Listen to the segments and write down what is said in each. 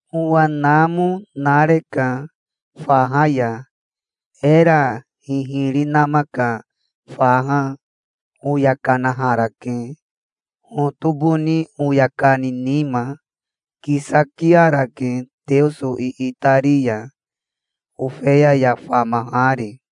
Owa namo nareka faha ya, era hihiri nama ka faha. Oya kanaharake hotoboni oya kani nima. Kisakiarake Teoso iitari ya, Ofeya ya famahari.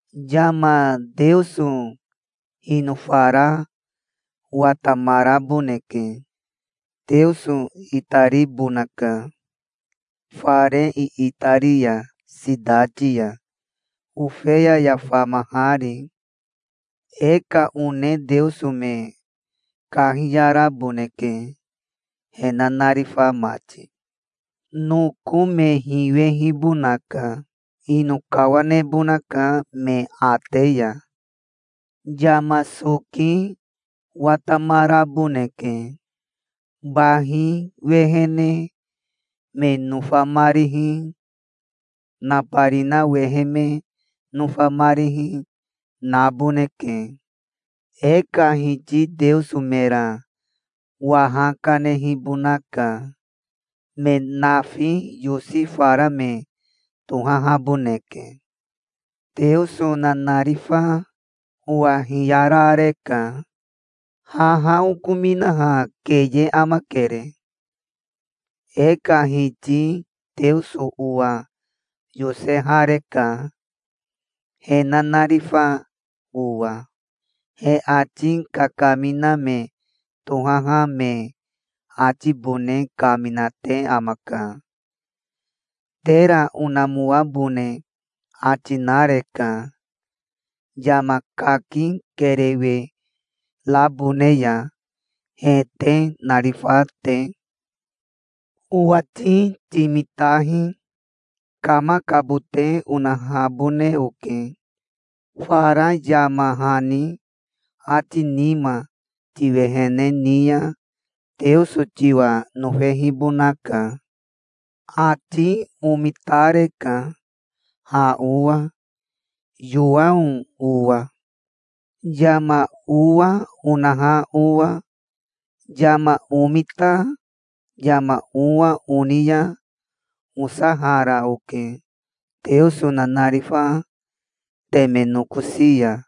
Yama Teoso hinofara watamaraboneke. Teoso itaribonaka fare iitari ya sitati ya, Ofeya ya famahari. E ka one Teoso me kahiyaraboneke, he nanarifa mati. Noko me hiwehibonaka. Ino kawanebonaka me ate ya. Yama soki watamaraboneke. Bahi wehene me nofamarihi, nabarina wehe me nofamarihi, naboneke. E ka Hiti Teoso mera waha kanehibonaka. Me nafi yosi fara me tohahaboneke. Teoso nanarifa owa hiyarareka. "Haha okominaha keye amakere. E ka Hiti Teoso owa yosehareka, he nanarifa owa. He ati kakamina me tohaha me atibone kaminate amaka. Tera onamoabone ati nareka, yama kaki kerewe rabone ya, he te narifa te". "Owati timitahi. Kamakabote onahabone oke. Fara yama hani ati nima tiwehene ni ya Teoso tiwa nofehibonaka". Ati omitareka ha owa, Yowao owa, yama owa onaha owa. Yama omita yama owa oni ya osahara oke Teoso nanarifa teme nokosi ya,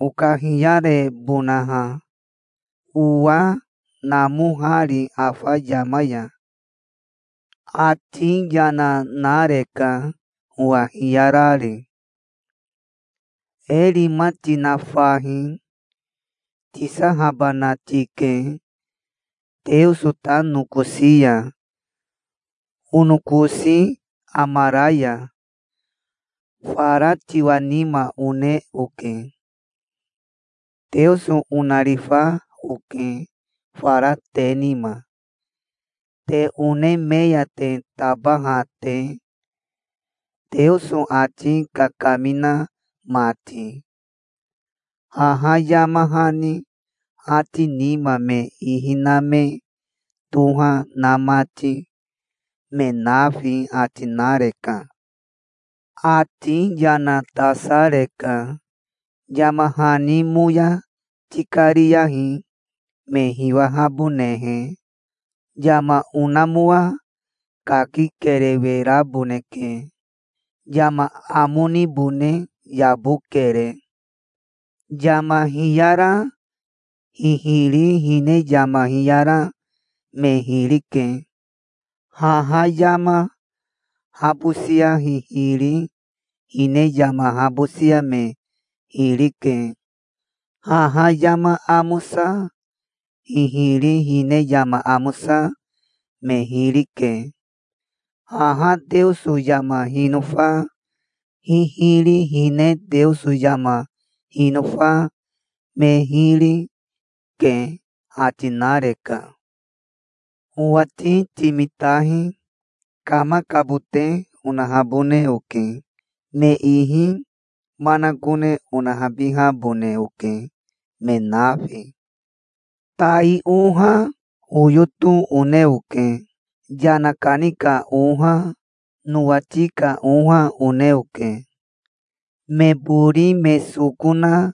okahiyarebonaha, owa namohari afa yama ya. Ati yana nareka owa hiyarari. "E rima tina fahi. Tisahabana tike Teoso ta nokosi ya, onokosi amara ya. Fara tiwa nima one oke. Teoso onarifa oke fara te nima, te one me ya te tabaha te, Teoso ati kakamina mati, haha yama hani ati nima me ihi na me toha na mati, me nafi", ati nareka. Ati yana tasareka. "Yama hani moya tikariyahi, me hiwahabonehe. Yama onamoa kaki kerewe raboneke. Yama amo nibone yabokere. Yama hiyara hihiri hine yama hiyara me hiri ke. Haha yama habosia hihiri hine yama habosia me hiri ke. Haha yama amosa hihiri hine yama amosa me hiri ke. Haha Teoso yama hinofa hihiri hine Teoso yama hinofa me hiri, ke", ati nareka. "Owati timitahi. Kamakabote onahabone oke. Me ihi manakone onahabihabone oke, me nafi. Tai oha, oyoto one oke. Yana kani ka oha, nowati ka oha one oke". Me bori me soko na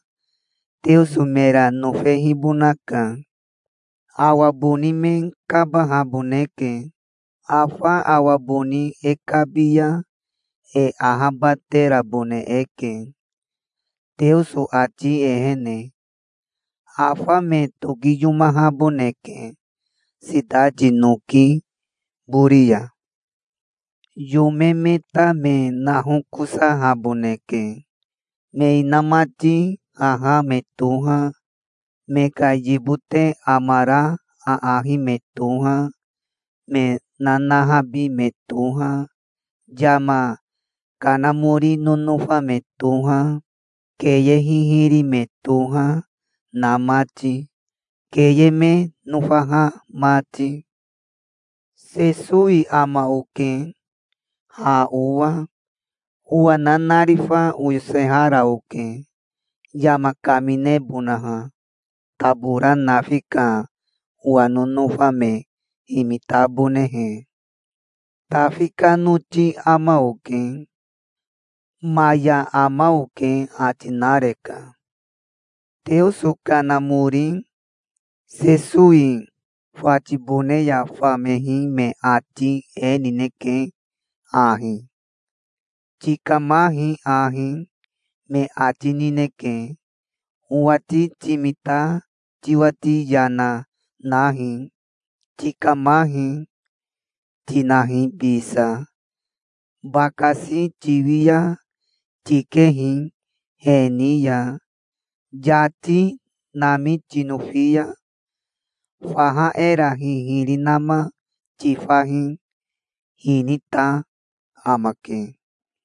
Teoso mera nofehibonaka. Awa boni me kabahaboneke. Afa awa boni e kabi ya e ahabaterabone eke Teoso ati ehene. Afa me tokiyomahaboneke sitati noki bori ya. Yome me ta me nahokosahaboneke. Me inamati haha me toha, me ka yibote amara aahi me toha, me nanahabi me toha, yama kanamori nonofa me toha, keye hihiri me toha, na mati, keye me nofaha mati. "Sesowi ama oke ha owa. Owa nanarifa oyosehara oke, yama kaminebonaha, tabora nafi ka owa nonofa me himitabonehe. Tafi ka noti ama oke. Maya ama oke", ati nareka. Teoso Kanamori Sesowi fatibone ya famehi me ati e nineke ahi: "Tikamahi ahi", me ati nineke. Owati timita tiwati yana nahi. "Tikamahi", tinahi bisa. Bakasi tiwi ya tikehi he ni ya. Yati nami tinofi ya faha era hihiri nama tifahi. Hinita amake.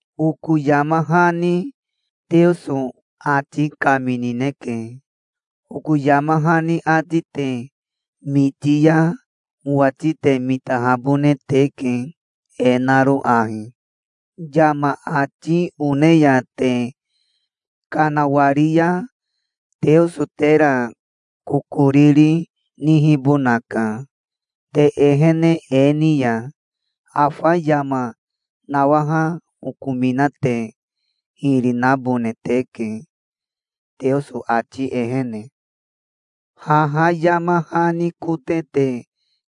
Oko yama hani Teoso ati kaminineke. Oko yama hani ati te miti ya, owati te mitahabone teke e naro ahi: yama ati one ya te kanawari ya Teoso tera kokoriri nihibonaka. Te ehene e ni ya afa yama nawaha okomina te hiri nabone teke Teoso ati ehene. Haha yama hani kote te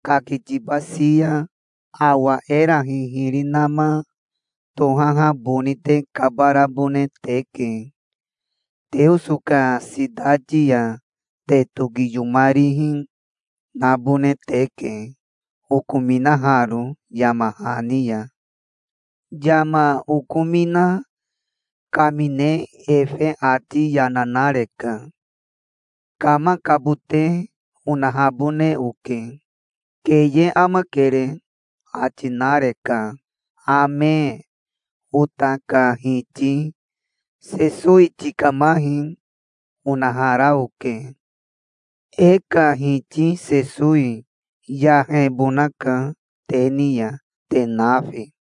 kakitibasi ya awa era hihiri nama tohaha boni te kabarabone teke. Teoso ka sitati ya te tokiyomarihi nabone teke, okominaharo yama hani ya. Yama okomina kamine efe ati yana nareka. "Kamakabote onahabone oke. Keye amakere", ati nareka. Ame. Ota ka Hiti Sesowi tikamahi, onahara oke. E ka Hiti Sesowi yahebonaka te ni ya, te nafi.